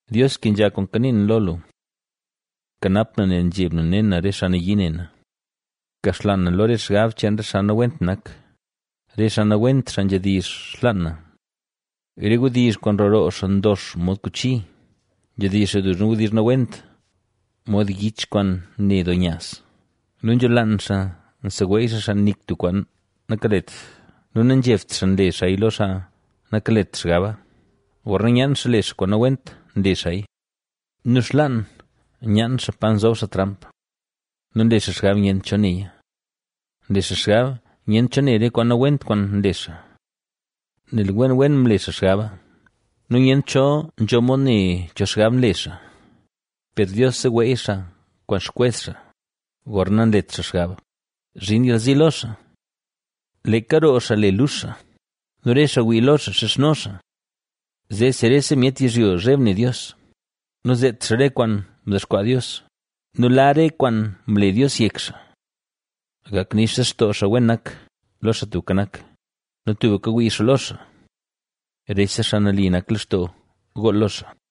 Dios kenzha kwaan kanii na lo lu; kanap na nel nzheb na ne na re xaa nayii ne na. Kaxlaan na lo re xgab cheen re xaa nawent nak, re xaa nawent xaa nzhedizh xlaan na. Re wdizh kwaan nroo roo xaa ndox mod kuchi, nzhedizh xaa duzna wdizh nawent, mod yich kwaan ne doo nyaaz. Nu nzholaan xaa nseweey xaa xaa nik tub kwaan nakalet nu nanzhebt xaa nle xaaya lo xaa nakalet xgaba. Gorna nyaan xaa le xaa kwaan nawent nle xaaya nu xlaan nyaan xaa pa zob xaa tramp nu nle xaa xgab nyent cho neya. Nle xaa xgab nyent cho ne re kwaan nawent kwaan nle xaa, nel wen wen mle xaa xgaba nu nyent cho nzho mod ne cho xgab nle xaa. Per Dios seweey xaa kwaan xkwez xaa, gorna nanlet xaa xgab, zhin yalzi lo xaa. Leeka roo xaa le lux xaa nu re xaa wii lo xaa xizhno xaa. Zeesi rese myet yizhyo zheb ne Dios nu zeet xaa re kwaan mdexkwaa Dios nu la re kwaan mle Dios yek xaa. Gak nix lextoo xaa wen nak, lo Xaa Tubka Nak, nu tubka wii xaa lo xaa; ¡rese xaa nali nak lextoo gool lo xaa!